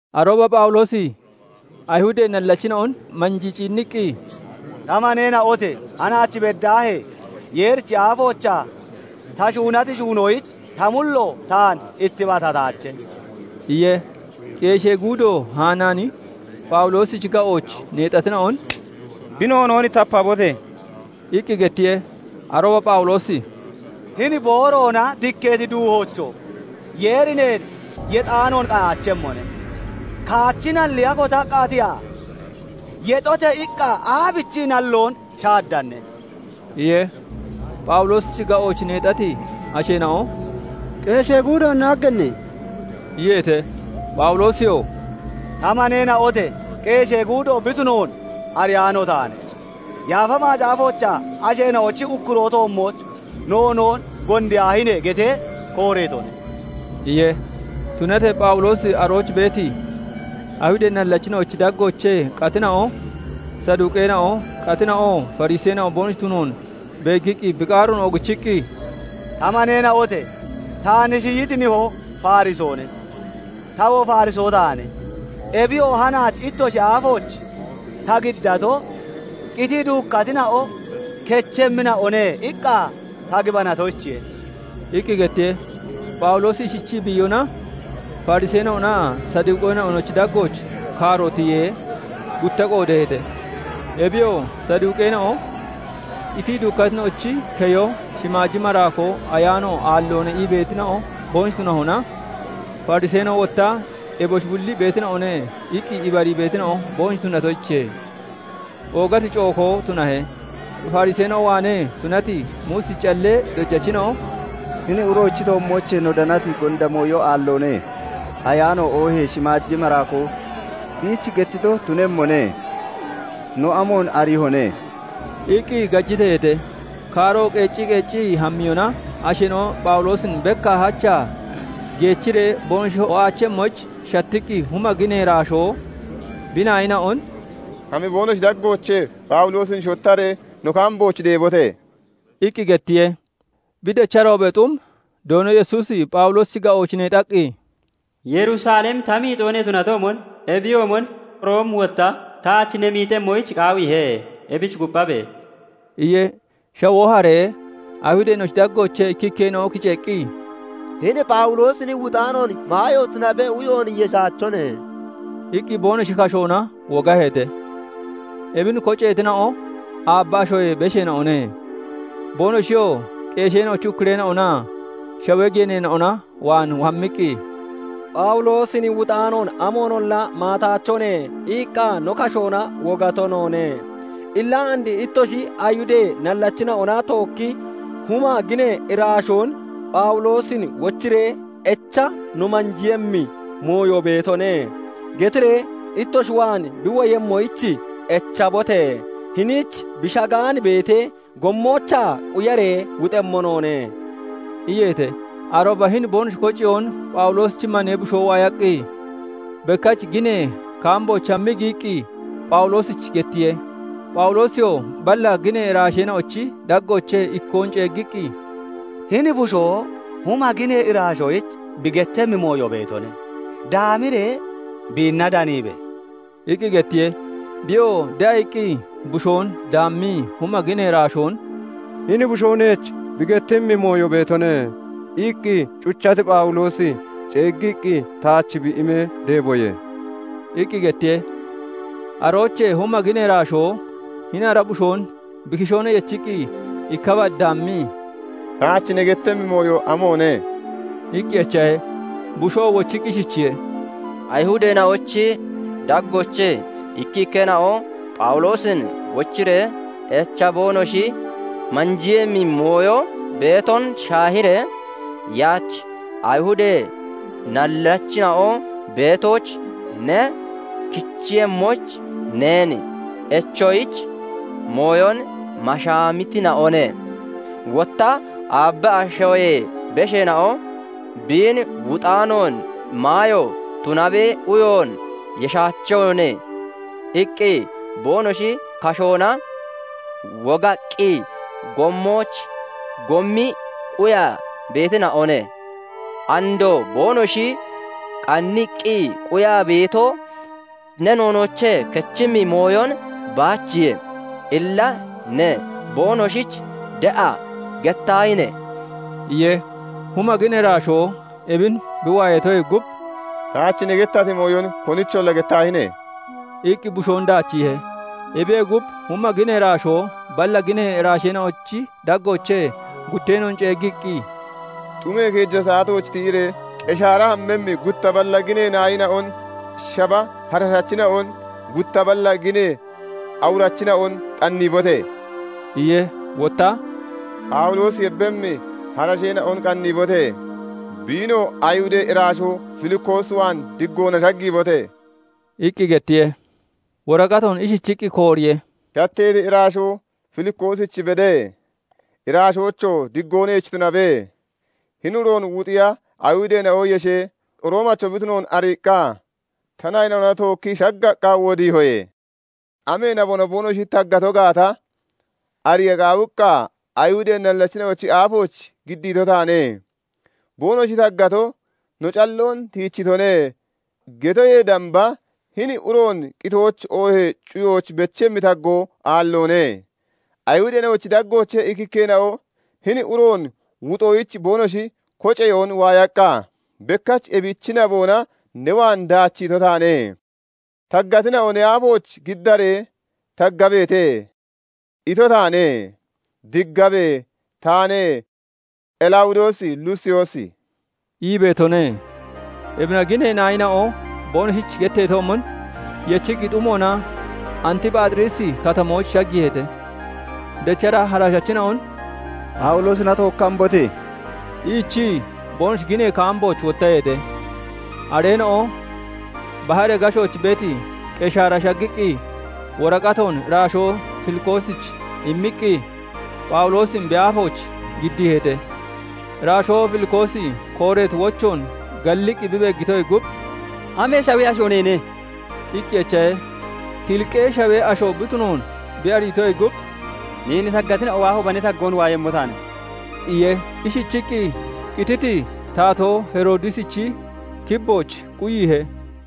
Arooba Phawuloosi Ayihudee nallachina'on manjii ciinniqqi, "Ta maneena'ote! Hanaach beddaahee Yeerichi aafoochaa ta shuunati shuunoyich ta mullo taan ittibatataache" iye. Qeeshee guudo Hanaani Phawuloosichi ga'ooch neexatina'on "Bi noonoon tapabote!" iqqi gettiye. Arooba Phawuloosi "Hini booroona dikkeeti duuhoocho! Yeeri neen yexaanoon qayaachemmone; kaachi nalliya kotaqqa tiyaa, 'Yexote!' iqqa aabichii nalloon shaaddanne?" iye. Phawuloosichi ga'ooch neexati asheena'o "Qeeshee guudoon naagganne!" iyeete. Phawuloosiyoo "Ta maneena'ote! qeeshee guudo bi tunoon ariyaano taane; Yaafa Macaafoochaa 'Asheena'ochi ukkuroo toommooch noonoon gondiyaahine!' getee kooreetone" iye. Tunatee Phawuloosi arooch beeti, Ayihudee nallachina'ochi daggoochee qatina'o Saduqeena'o, qatina'oo Fariseena'o boonoshi tunoon beeggiqqi bi qaaroon oogichiqqi, "Ta maneena'ote! Taan shiyiti nihoo Farisoone; tawoo Fariso taane. Ebiyoo hanaach ittoshi aafooch ta giddato, 'Qitii duukkatina'o kechemmina'one' iqqa ta gibanatoyichiye" iqqi gettiye. Phawuloosi ishichii bi iyona, Fariseena'onaa Saduqeena'onochi daggooch kaaro tiyee, gutta qoodeeheete. Ebiyoo Saduqeena'o "Qitii duukkatina'ochi keyo, shimaaji maraakoo, ayaano aalloone" ii beetina'o boonoshi tunahona, Fariseena'o wotta "Eboshi bulli beetina'one" iqqi ibarii beetina'o boonoshi tunatoyichiye. Oogati cookoo tunahe; Fariseena'o waanee tunati Muusichi callee dojachina'o "Hini uroochi toommoochee no danati gonda mooyo aalloone; ayaano oohee shimaaji maraakoo biich gettito tunemmone; no amoon ariihone?" iqqi gajiteeheete. Kaaro qeeccii qeeccii hammiyona, asheena'o Phawuloosin bekkaa hachaa geechiree boonoshi ho'aachemmoyich shattiqqi, huma ginee iraashoo bi naayina'on "Hami boonoshi daggoochee Phawuloosin shottaree no kaambooch deebote!" iqqi gettiye. Bi decharoobee xum Doono Yesuusi Phawuloosichi ga'ooch neexaqqi, "Yerusalem ta miixoo ne tunatoomon, ebiyoomon Room wotta taach ne miixemmoyich qaawiihe; ebich kupphabe!" iye. Shawoo haree, Ayihudeena'ochi daggoochee ikkikkeena'o kiceeqqi, "Hini Phawuloosin wuxaanoon maayo tunabe uyoon yeshaachone" iqqi boonoshi kashoona wogaheete. Ebin koceetina'o aabba ashoyee besheena'one. Boonoshiyoo qeesheena'ochi ukkureena'onaa shawee geeneena'ona waan hammiqqi, " 'Phawuloosin wuxaanoon amoonolla maataachone' iqqa no kashoona wogato noone. Illa and ittoshi Ayihudee nallachina'ona tookki huma ginee iraashoon 'Phawuloosin wochiree echa no manjiiyemmi mooyo beetone' getiree, ittoshi waan bi woyemmoyich echabote! Hiniich bi shagaan beetee, gommoochaa quyaree wuxemmo noone" iyeete. Arooba hini boonoshi koceyoon Phawuloosichi manee bushoo waayaqqi, bekkach ginee kaambooch hammii giyiqqi, Phawuloosich gettiye. Phawuloosiyoo balla ginee iraasheena'ochi daggoochee ikkoon ceeggiqqi, "Hini bushoo huma ginee iraashoyich bi gettemmi mooyo beetone; daamiree biinna daniibe!" iqqi gettiye. Biyoo de'a iqqi bushoon daammii, huma ginee iraashoon " 'Hini bushoo neech bi gettemmi mooyo beetone' iqqi, cuchati Phawuloosi ceeggiiqqi taach bi imee, deeboye" iqqi gettiye. Aroochee huma ginee iraashoo hini ara bushoon bi kishoona yechiqqi, ikka bad daammii, "Taach ne gettemmi mooyo amoone?" iqqi echahe. Bushoo wochiqqi ishichiye:- "Ayihudeena'ochi daggoochee ikkikkeena'o Phawuloosin wochiree echa boonoshi manjiiyemmi mooyo beeton shaahiiree, yaach Ayihudee nallachina'o beetooch ne kichemmoyich, neen echoyich mooyon mashaamiitina'one. Wotta aabba ashoyee besheena'o 'Biin wuxaanoon maayo tunabe uyoon yeshaachone' iqqi boonoshi kashoona wogaqqi, gommooch goommii quyaa beetina'one. Andoo boonoshi qanniqqi quyaa beeto, ne noonoochee kechemmi mooyon baachiye. Illa ne boonoshich de'a gettaahine!" iye. Huma ginee iraashoo ebin bi waayatoyee gub, "Taach ne gettati mooyon konicholla gettaahine!" iqqi bushoon daachiihe. Ebiyee gub, huma ginee iraashoo balla ginee iraasheena'ochi daggoochee gutteena'on ceeggiiqqi, "Xumee keeja saatooch tiyiree, Qeshaara hammemmi gutta balla ginee naayina'on, shaba harashachina'on, gutta balla ginee awurachina'on qanniibote!" iye. Wotta "Phawuloosi yebbemmi harasheena'on qanniibote! Biinoo Ayihudee iraashoo Filikoos waan diggoona shaggiibote!" iqqi gettiye. Woraqatoon ishichiqqi kooriye:- "Shatteeti iraashoo Filikoosich bede! Iraashoocho! Diggoo neech tunabe! "Hini uroon wuxiya Ayihudeena'o yeshee, Roomacho bi tunoon ariiqqa, ta naayina'ona tookkii shaggaqqa wodiihoye. Amee naboona boonoshi taggato gaata ariya qaawiqqa, Ayihudee nallachina'ochi aafooch giddiito taane. Boonoshi taggato, 'No calloon tiichitone' getoyee damba hini uroon qitooch, oohee cuyooch bechemmi taggoo aalloone. Ayihudeena'ochi daggoochee ikkikkeena'o hini uroon wuxoyich boonoshi koceyoon waayaqqa, bekkach ebichi naboona ne waan daachiito taane. Taggatina'o ne aafooch giddaree, 'Taggabeete' ito taane. Diggabe. Taane Qelawudoos Lusiyoosi" ii beetone. 31Ebina ginee naayina'o boonoshich getteetoomon, yechiqqi xumoona Antiphaaxiriisi Katamooch shaggiiheete. 32Dechara harashachina'on "Phawuloosina tookki hambote!" iichii, boonoshi ginee kaambooch wottaheete. 33Areena'o baharee gashooch beeti Qeshaara shaggiqqi, woraqatoon iraashoo Filikoosich immiqqi, Phawuloosin bi aafooch giddiiheete. 34Iraashoo Filikoosi kooreeti wochoon galliqqi bi beeggitoyee gub, "Amee shawee asho neene?" iqqi echahe. Kiliqee shawee asho bi tunoon bi ariitoyee gub, 35"Neen taggatina'o waahooba, ne taggoon waayemmo taane" iye. Ishichiqqi qititi taatoo Heroodisichi kibbooch quyiihe.